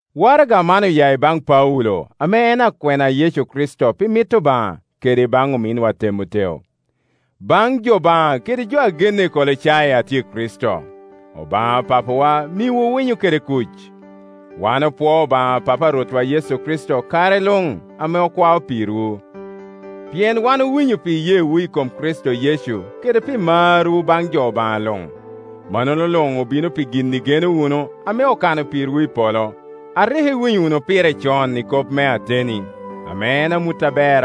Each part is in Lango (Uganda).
Waraga man oya i baŋ Paulo ame en akwena a Yecu Kricito pi mit Obaŋa, kede i baŋ ominwa Temoteo. Baŋ jo Obaŋa kede jo a genne i Kolocai, a tye i Kricito: Obaŋa Papa wa miwu winyo kede kuc. Wan opwoo Obaŋa Papa a Rwotwa Yecu Kricito kare luŋ ame okwao pirwu. Pien wan owinyo pi iyeewu i kom Kricito Yecu kede pi marwu baŋ jo Obaŋa luŋ. Mannono luŋ obino pi gin igeno wunu ame okano pirwu i polo, a rik iwinyo wunu pire con i kop me ateni, ame en amut aber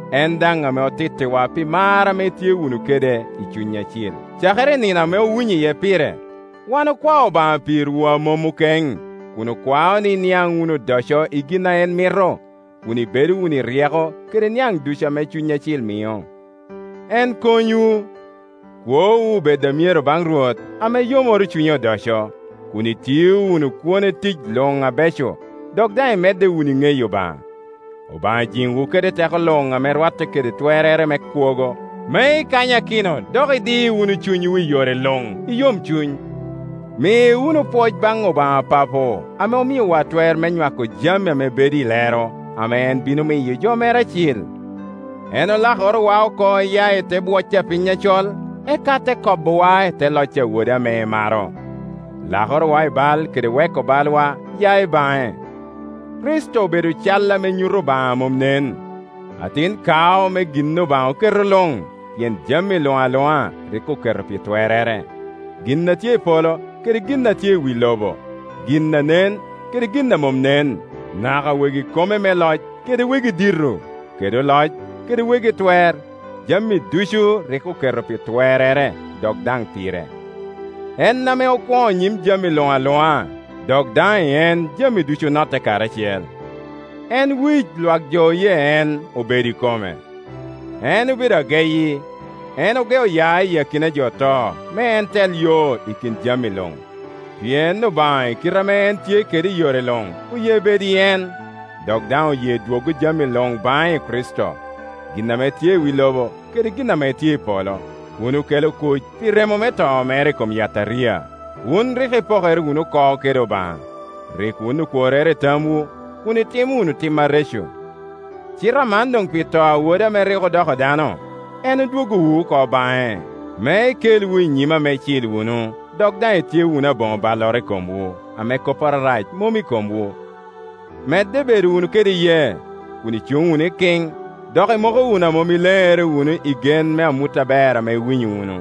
En daŋ ame otittiwa pi mar ame itye wunu kede i Cuny Acil. Cakere i nino ame owinyo iye pire, wan okwao Obaŋa pirwu a mom okeŋ, kun okwao ni iniaŋ wunu odoco i gin a en mito, kun ibedo wunu i ryeko kede niaŋ ducu ame Cuny Acil mio. En konywu, kwowu obed a myero baŋ Rwot, ame yomoro cunye odoco, kun itio wunu kwone tic luŋ abeco, dok daŋ imedde wunu i ŋeyo Obaŋa. Obaŋa jiŋwu kede teko luŋ ame rwatte kede twerrere me kwogo, me ikanyakino dok idi wunu cunywu i yore luŋ i yomcuny. Mi wunu pwoc baŋ Obaŋa Papo ame omiowa twer me nywako jami ame bedo i lero, ame en bino miyo jo mere acil. En olakorowa oko iya i te bwoc a piny acol, eka te kobowa i te loc a Wode ame emaro. Lakorowa i bal kede weko balwa ya i baŋe. Kricito obedo cal ame nyuto Obaŋa a mom nen, atin kao me gin Obaŋa oketo luŋ; pien jami luŋ aluŋa rik oketo pi twerrere, gin a tye i polo kede gin a tye i wi lobo, gin a nen kede gin a mom nen, naka wegi kome me loc kede wegi dito, kede oloc, kede wegi twer. Jami ducu rik oketo pi twerrere dok daŋ pire. En ame okwoŋo nyim jami luŋ aluŋa, dok daŋ i en jami ducu onotte karacel. En wic, lwakjo oye en obedo kome. En obedo ageyi, en ogeo ya i akina jo oto, me en tel yo i kin jami luŋ. Pien Obaŋa i kite ame en tye kede i yore luŋ oye bedo i en; dok daŋ oye dwoggo jami luŋ baŋe i Kricito, gin ame tye i wi lobo kede gin ame tye i polo, kun okelo kuc pi remo me to mere i kom yataria. Wun rik ipokere wunu oko kede Obaŋa, rik wun okworrere i tamwu, kun itimo wunu tim areco. Cite aman doŋ pi to a Wode ame rik odoko dano, en odwoggowu oko baŋe, me ekelwu i nyime ame icil wunu, dok daŋ itye wunu aboŋo balloro i komwu, ame kopporo arac mom i komwu. Medde bedo wunu kede iyee, kun icuŋ wunu ikiŋ, dok imoko wunu a mom ileŋere i gen me amut aber ame iwinyo wunu,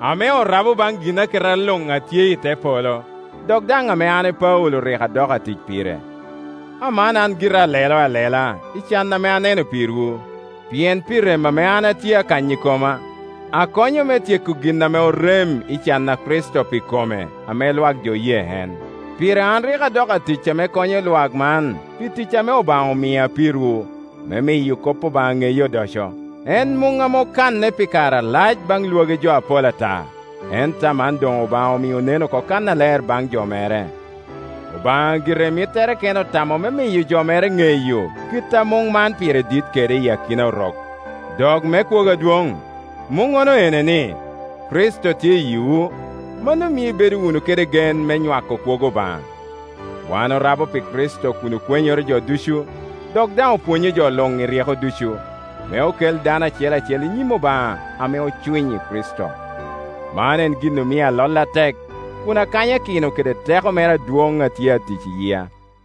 ame orabo baŋ ginaketa luŋ a tye i te polo, dok daŋ ame an Paulo rik adoko atic pire. Aman an gira alelo alela i can ame aneno pirwu, pien pi rem ame an atye akanyo i koma, akonyo me tyeko gin ame orem i can a Kricito pi kome, ame lwak jo oye en. Pire an rik adoko atic ame konyo lwak man pi tic ame Obaŋa omia pirwu, me miyo kop Obaŋa ŋeye odoco. En muŋ ame okanne pi kare alac baŋ lwagi jo apol ata, ento aman doŋ Obaŋa omio onen oko kannaler baŋ jo mere. Obaŋa gire i mittere kene otamo me miyo jo mere ŋeyo kit ame muŋ man pire dit kede iyi akina Orok, dok me kwogo adwoŋ. Muŋŋono ene, ni, Kricito tye yiwu; mano mio ibedo wunu kede gen me nywako kwogo Obaŋa. Wan orabo pi Kricito kun okwenyoro jo ducu, dok daŋ opwonyo jo luŋ i ryeko ducu, me okel dano acel acel i nyim Obaŋa ame ocwiny i Kricito. Man en gin omio alolle atek, kun akanyakino kede teko mere adwoŋ a tye atic i yia.